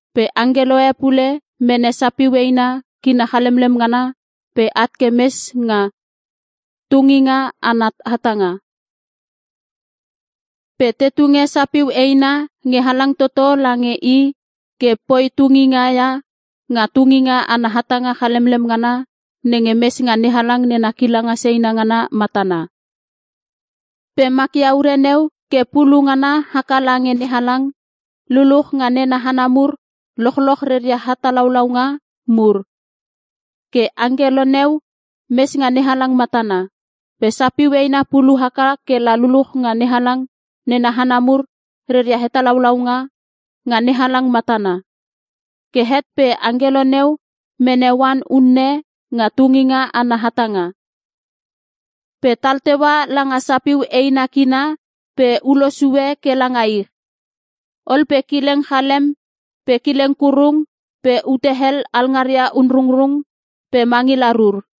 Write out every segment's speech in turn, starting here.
Pe angkelo e pule mene sapiu eina kina chalemlem ngana pe at ke mes nga tunginga ana hatanga. Pe te tunge sapiu eina nge halang toto lange i ke poi tunginga ia nga tunginga ana hatanga chalemlem ngana nenge mes nga NeHalang nena kilanga seina ngana matana. Pe makia ure neu ke pulu ngana haka lange NeHalang, luluch nga nena hana mur lochloch reria hetalaulaunga mur. Ke angkelo neu mes nga NeHalang matana. Pe sapiu eina pulu haka kela luluch nga NeHalang nena hana mur reria hetalaulaunga nga NeHalang matana. Ke het pe angkelo neu mene oan unne nga tunginga ana hatanga, pe tal teua langa sapiu eina kina pe ulo sue ke langa ich. Ol pe kileng chalem pe kileng kurung pe ute hel alngaria onrungrung pe mangila rur.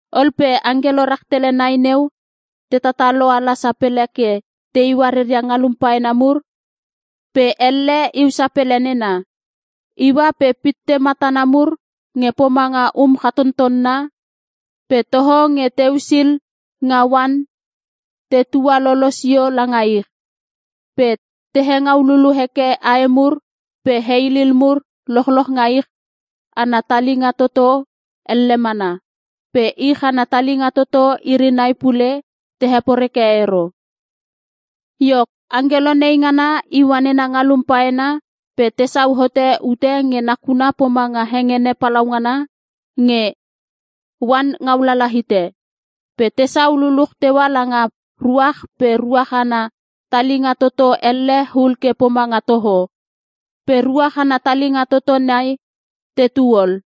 Ol pe angkelo rahtele nai neu te tatalo ala sapele ke teiua reria ngalum paena mur pe elle iu sapele nena. Iua pe pitte matana mur nge pomanga um chatottonna pe toho nge teusil nga oan te tualolo sio langa ich. Pe te hengau lulu heke ae mur pe heilil mur lochloch nga ich ana talinga toto elle mana. Pe ich ana talinga toto iri nai pule te heporeke ero. Iok, angkelo nei ngana iua nena ngalum paena pe tesau hote ute nge nakuna pomanga hengene palaungana nge oan ngaulala hite. Pe tesau puluch teua langa ruach pe ruach ana talinga toto elle hul ke pomanga toho. Pe ruach ana talinga toto nai, tetu ol.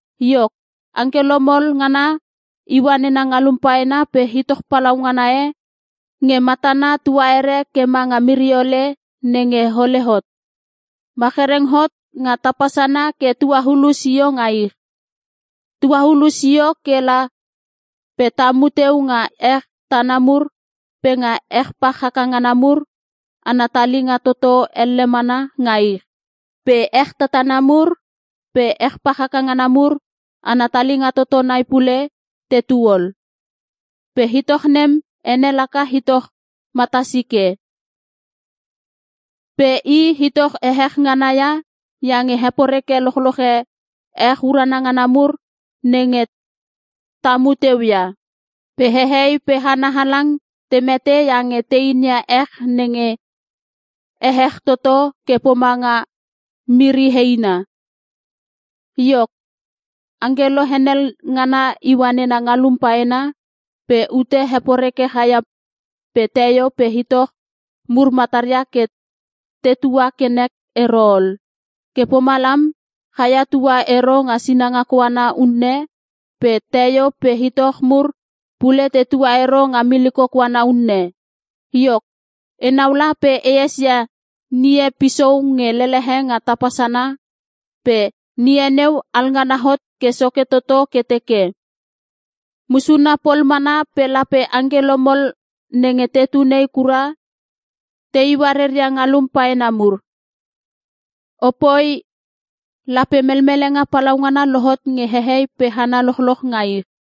Iok, angkelo mol ngana iua nena ngalum paena pe itoch palaungana e nge matana tuaere ke manga miriole nenge hole hot, machereng hot nga tapa sana ke tuaulu sio nga ich. Tuaulu sio kela pe tamu teu nga ech tana mur pe nga ech pach haka ngana mur ana talinga toto elle mana nga ich. Pe ech tatana mur pe ech pach haka ngana mur ana talinga toto nai pule, tetu ol. Pe itoch nem ene laka itoch Matasike. Pe i itoch ehech ngana ia, iange heporeke lochloche ech urana ngana mur nenge tamu teu ia. Pe hehei pe hana halang te mete iange te inia ech nenge ehech toto ke pomanga miri heina. Iok, angkelo henel ngana iua nena ngalum paena pe ute heporeke chaia pe teio pe itoch mur mataria ke tetua ke nek ero ol. Ke pomalam, chaia tua ero nga sinanga koana unne pe teio pe itoch mur pule tetua ero nga miliko koana unne. Iok, enau la pe e esia ngie pisou nge lelehe nga tapa sana. Pe ngie neu alngana hot ke soke toto ke teke, “Musuna pol mana pe lape angkelo mol nenge tetu nei kura teiua reria ngalum paena mur. Opooi! Lape melmelenga palaungana lohot nge hehei pe hana lochloch nga ich!”